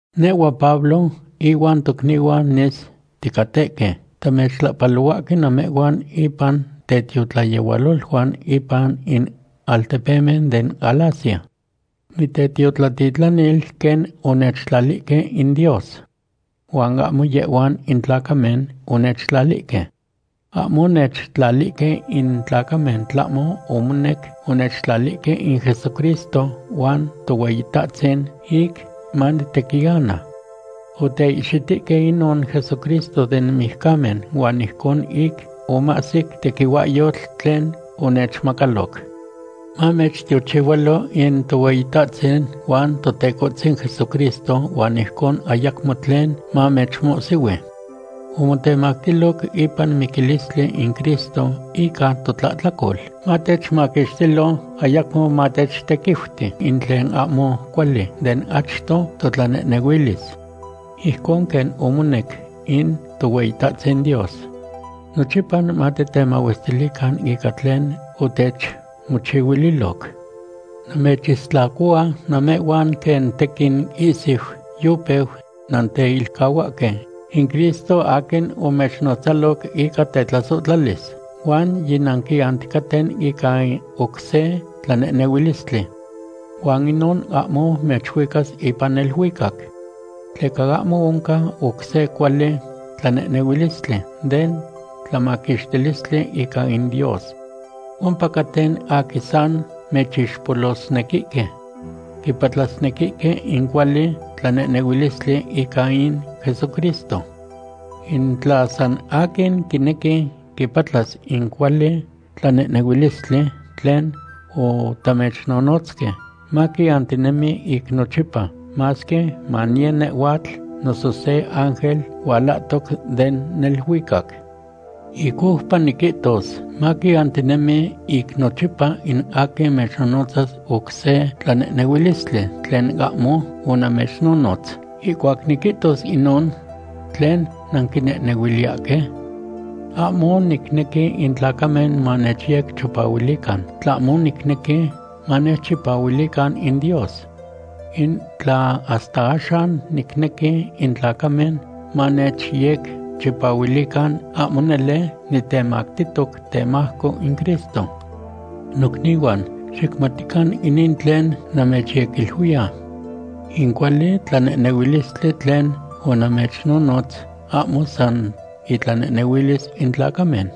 Nehhua Pablo ihuan tocnihuan nis ticatehque, tamechtlahpalohuahque namehhuan ipan tetiotlayehualoluan ipan in altepemen den Galacia. Nitetiotlatitlanil quen onechtlalihque in Dios. Huan ahmo yehhuan in tlacamen onechtlalihque. Ahmo onechtlalihque in tlacamen, tlahmo omonec onechtlalihque in Jesucristo huan Tohueyitahtzin ic manitequiana. Oteihxitihque inon Jesucristo den mijcamen huan ijcon ic omahsic tequihuahyotl tlen onechmacaloc. Mamechtiochihualo in Tohueyitahtzin huan Totecohtzin Jesucristo huan ijcon ayacmo tlen mamechmohsihui. Omotemactiloc ipan miquilistli in Cristo ica totlahtlacol, matechmaquixtilo, ayacmo matechtequiuti in tlen ahmo cuali den achto totlanehnehuilis. Ijcon quen omonec in Tohueyitahtzin Dios. Nochipa matitemahuestilican ica tlen otechmochihuiloc. Namechistlacohua namehhuan quen tequin ihsui yopeu nanteilcahuahque in Cristo aquin omechnotzaloc ica tetlasohtlalis, huan yinanquianticaten ica in oc se tlanehnehuilistli. Huan inon ahmo mechuicas ipan neluicac. Tleca ahmo oncan oc se cuali tlanehnehuilistli den tlamaquixtilistli ica in Dios. Ompacaten aquin san mechixpolosnequihque. Quipatlasnequihque in cuali tlanehnehuilistli ica in Jesucristo. In tla san aquin quinequi quipatlas in cuali tlanehnehuilistli tlen otamechnonotzque, maquiantinemi ic nochipa, masque maniye nehhuatl, noso se ángel hualahtoc den neluicac. Ic oupa niquihtos; maquiantinemi ic nochipa in aquin mechnonotzas oc se tlanehnehuilistli tlen ahmo onamechnonotz. Ihcuac niquihtos inon, ¿tlen nanquinehnehuiliyahque? Ahmo nicnequi in tlacamen manechyecchipahuilican, tlahmo nicnequi manechchipahuilican in Dios. In tla hasta axan nicnequi in tlacamen manechyecchipahuilican, ahmo nele nitemactihtoc temajco in Cristo. Nocnihuan, xicmatican inin tlen namechyequiluiya. In cuali tlanehnehuilistli tlen onamechnonotz ahmo san itlanehnehuilis in tlacamen.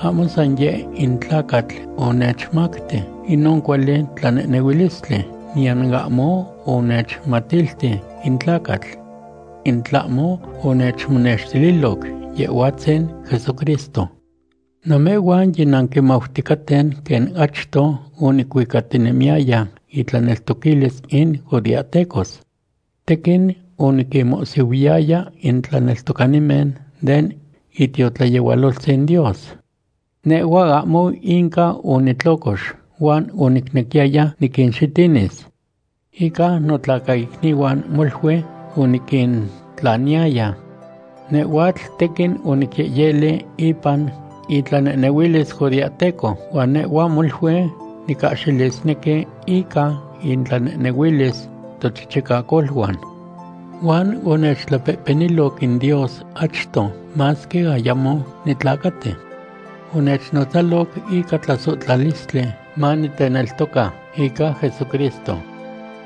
Ahmo san yeh in tlacatl onechmacti inon cuali tlanehnehuilistli, niyan ahmo onechmatilti in tlacatl. In tlahmo onechmonextililoc Yehhuatzin Jesucristo. Namehhuan yinanquimauticaten quen achto onicuicatinemiyaya intlaneltoquilis in judeahtecos. Tequin oniquinmohsihuiyaya in tlaneltocanimen den itiotlayehualoltzin Dios. Nehhua ahmo inca onitlocox huan onicnequiyaya niquinxitinis. Ica notlacaicnihuan molui oniquintlaniyaya. Nehhuatl tequin onicyehyeli ipan itlanehnehuilis judeahteco, huan nehhua molui nicahxilisnequi ica intlanehnehuilis tochichicacoluan. Huan onechtlapehpeniloc in Dios achto masque ayamo nitlacati. Onechnotzaloc ica tlasohtlalistli maniteneltoca ica Jesucristo.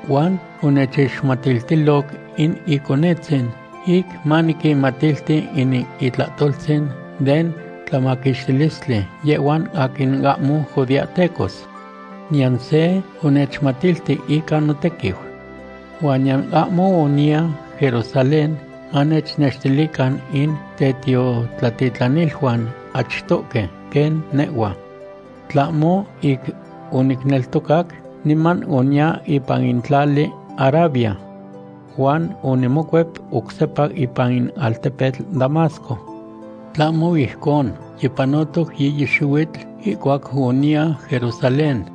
Huan onechixmatiltiloc in Iconetzin ic maniquinmatilti in itlahtoltzin den tlamaquixtilistli yehhuan aquin ahmo judeahtecos. Niyan se onechmatilti ica notequiu. Huan niyan ahmo oniya Jerusalén manechnextilican in tetiotlatitlaniluan achtohque quen nehhua. Tlahmo ic onicneltocac, niman oniya ipan in tlali Arabia. Huan onimocuep oc sepa ipan in altepetl Damasco. Tlahmo ijcon, yipanotoc yiyi xihuitl ihcuac oniya Jerusalén.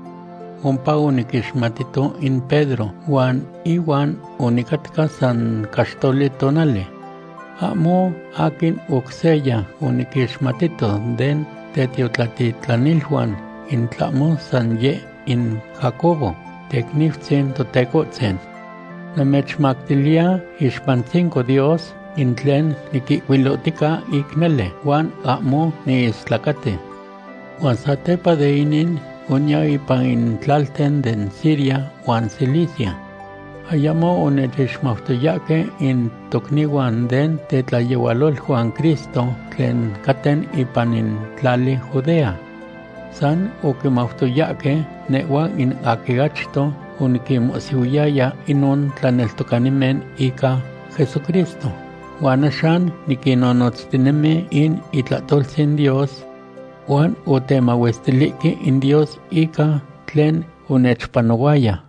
Ompa oniquixmatito in Pedro, huan ihuan onicatca san caxtoli tonali. Ahmo aquin oc seya oniquixmatito den tetiotlatitlaniluan, in tlahmo san yeh in Jacobo, teicniutzin Totecohtzin. Namechmactiliya iixpantzinco Dios in tlen niquihcuilohtica ic nele, huan ahmo niistlacati. Huan satepa de inin, oniya ipan in tlalten den Siria huan Cilicia. Ayamo onechixmautoyahque in tocnihuan den tetlayehualoluan Cristo tlen caten ipan in tlali Judea. San oquimautoyahque nehhua in aquin achto oniquinmohsihuiyaya inon tlaneltocanimen ica Jesucristo, huan axan niquinnonotztinemi in itlahtoltzin Dios. Huan otemahuestilihque in Dios ica tlen onechpanohuaya.